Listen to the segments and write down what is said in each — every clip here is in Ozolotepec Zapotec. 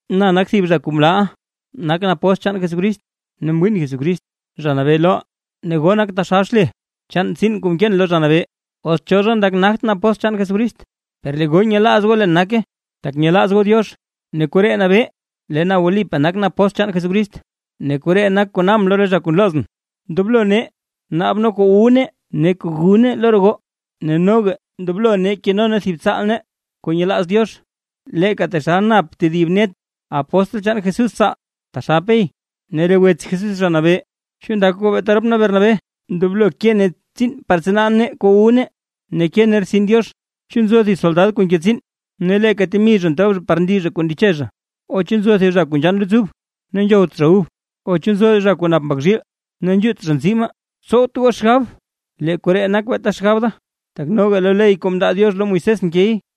Na nak thib zha kuu mlaaʼa. Nakʼn apóstl chaan Jesucrist ne mwiin Jesucrist, Zha Nabee loʼaa. Ne goo nak taxal xle chaan tsiin kuu mkeen lo Zha Nabee. Os cho zha ndak nagtʼn apóstl chaan Jesucrist, per lee goo nyelaaz goo leen nake, tak nyelaaz goo Diox, ne koree nabee lee na wlipaa nakʼn apóstl chaan Jesucrist. Ne koree nak kuu nkabʼn lo re zha kuu nloozʼn: Ndoblo nee naab nee kuu wu nee ne kuu gu nee lo re goo. Ne noga ndoblo nee keno nee thib tsaal nee kuu nyelaaz Diox, leeka taxal nap tedib net re apóstl chaan Jesús tsaal, taxal Pey ne re wets Jesús Zha Nabee. ¿Chu ndak goo beeta rop nee Bernabé ndoblo ke nee tsiin, par tsanaa nee kuu wu nee ne ke nee rtsin Diox? ¿Chu nzo thib soldad kuu nke tsiin ne leeka temi zha ntob zha par ndi zha kuu ndeche zha? ¿O chu nzo thib zha kuu nzhann luts ub ne nzhowt zha ub? ¿O chu nzo zha kuu nap mbak zhiil, ne nzhuut zha nzii maa? Tsowt goo xgab lee koree nak beeta xgab da, tak noga lo ley kuu mndaa Diox lo Moisés nkey.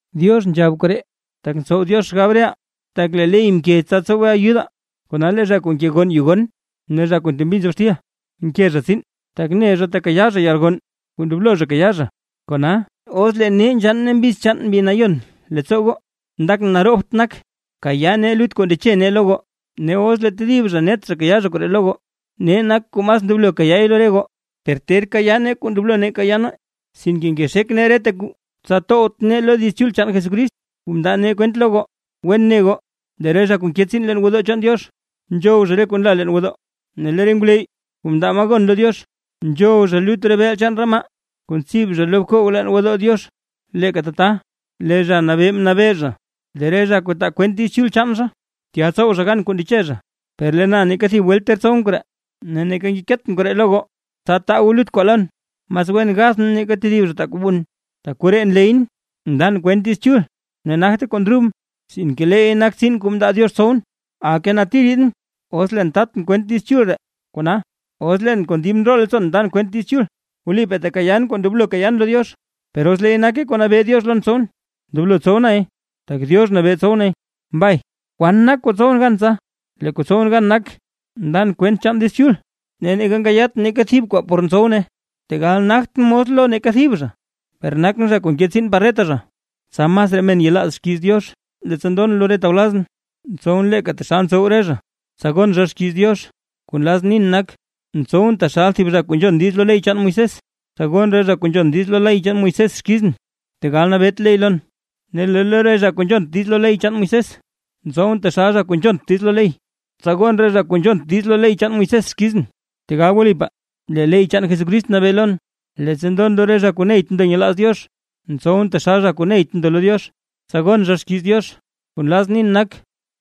Diox nzhab koree, tak ntsow Diox xgab reʼaa. Tak lee ley mke tsa tsowe ayudaa, kona lee zha kuu nke gonn yu gon ne zha kuu ntembi nzob xtil, nke zha tsiin tak ne zha tekayaa zha yalgonn kuu ndoblo zha kayaa zha. Kona, os lee nee nzhann nee mbiz chaan Mbi Nayon leettsoo goo, ndakʼn naroobt nak kayaa nee lut kuu ndeche nee lo goo. Ne os lee tedib net zha nkayaa koree lo goo, nee nak kuu mas ndoblo kayaay lo re goo. Per ter kayaa nee kuu ndoblo nee kayaa nee, sinke ngexek nee reta kuu tsa towt nee lo Diiz Chul chaan Jesucrist kuu mndaa nee kwent lo goo. Wen ne goo, lee re zha kuu nke tsiin leen gwodoo chaan Diox, nzhow zha re kuu nla leen gwodoo. Ne lee re ngwleyy kuu ndaa maa gon lo Diox, nzhow zha lut re beel chaan re maa kuu ntsib zha lo bkoog leen gwodoo Diox. Leeka tata, lee Zha Nabee mnabee zha, lee re zha kuu ndaa kwent Diiz Chul chaan zha, tya tsow zha gan kuu ndeche zha. Per lee na neeka thib welt ter tsowʼn koree, ne neeka ngekeetʼn koree lo goo, tsa taa goo lut kwaa lon. ¡Mas wen gathʼn nake tedib zha taa kuu wun! (Tak koree nleyʼn.) Ndan kwent Diiz Chul ne nagte kuu ndrubʼn, sinke leey nak tsiin kuu mndaa Diox tsowʼn. ¡Aka nati riidʼn, os leen tatʼn kwent Diiz Chul ree! Kona, os leen kon dib ndroo leettsoon ndan kwent Diiz Chul, wlipaa tekayaan kuu ndoblo kayaan lo Diox. Per os leey nake kuu nabee Diox lon tsowʼn, ndoblo tsow nay tak Diox nabee tsowʼn. Mbay. ¿Kwan nak kuu ntsowʼn gan tsa? Lee kuu ntsowʼn gan nak, ndan kwent chaan Diiz Chul ne nkayaatʼn neeka thib kwaa por ntsow nay. Tegal nagtʼn mos lo neeka thib zha, per nakʼn zha kuu nke tsiin par reta zha, tsa masraa men yelaaz xkiiz Diox. Leettsa ndon lo re tawlazʼn, ntsowʼn leeka taxal ntsow re zha, tsa gon zha xkiiz Diox. Kuu nlazʼn nin nak, ntsowʼn taxal thib zha kuu nzhon diiz lo ley chaan Moisés, tsa gon re zha kuu nzhon diiz lo ley Moisés xkizʼn, tegal nabeet ley lon. Ne lee lo re zha kuu nzhont diiz lo ley chaan Moisés, ntsowʼn taxal zha kuu nzhont diiz lo ley, tsa gon re zha kuu nzhont diiz lo ley chaan Moisés xkizʼn; tegal wlipaa lee ley chaan Jesucrist nabee lon. Leettsa ndon lo re zha kuu neyt ndo nyelaaz Diox, ntsowʼn taxal zha kuu neyt ndo lo Diox, tsa gon zha xkiiz Diox. Kuu nlazʼn nin nak,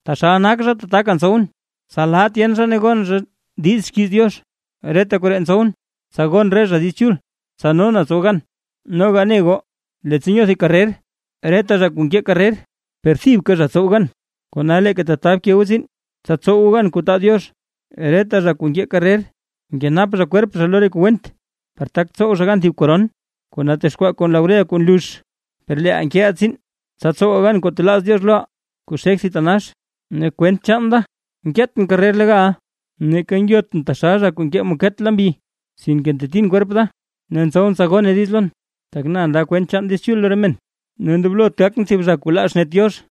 taxal nak zha tataka ntsowʼn, tsa laa tyen zha ne gon zha diiz xkiiz Diox. Reta koree ntsowʼn, tsa gon re zha Diiz Chul, tsa no na tsow gan. Noga neʼa goo, leettsa nyoo thib karrer, reta zha nkee karrer, per thibka zha ntsow gan. Kona leeka tata bke goo tsiin, tsa tsow goo gan kuu taa Diox. Reta zha kuu nkee karrer, nkenap zha kwerp zha lo re kuu went, par tak tsow zha gan thib koron kuu natexkwaa kon laurel kuu nlux. Per leeʼaa nkeʼaa tsiin, tsa tsowaa gan kuu talaaz Diox loʼaa, kuu xek thitanax. Ne kwent chaan da nkeetʼn karrer legal; ne neeka ngyotʼn taxal zha kuu nkee maket lo mbi. Sinke ntetin kwerp da, ne ntsowʼn tsa gone diiz lon, tak na ndaa kwent chaan Diiz Chul lo re men, ne ndoblot gakʼn thib zha kuu laa xnet Diox.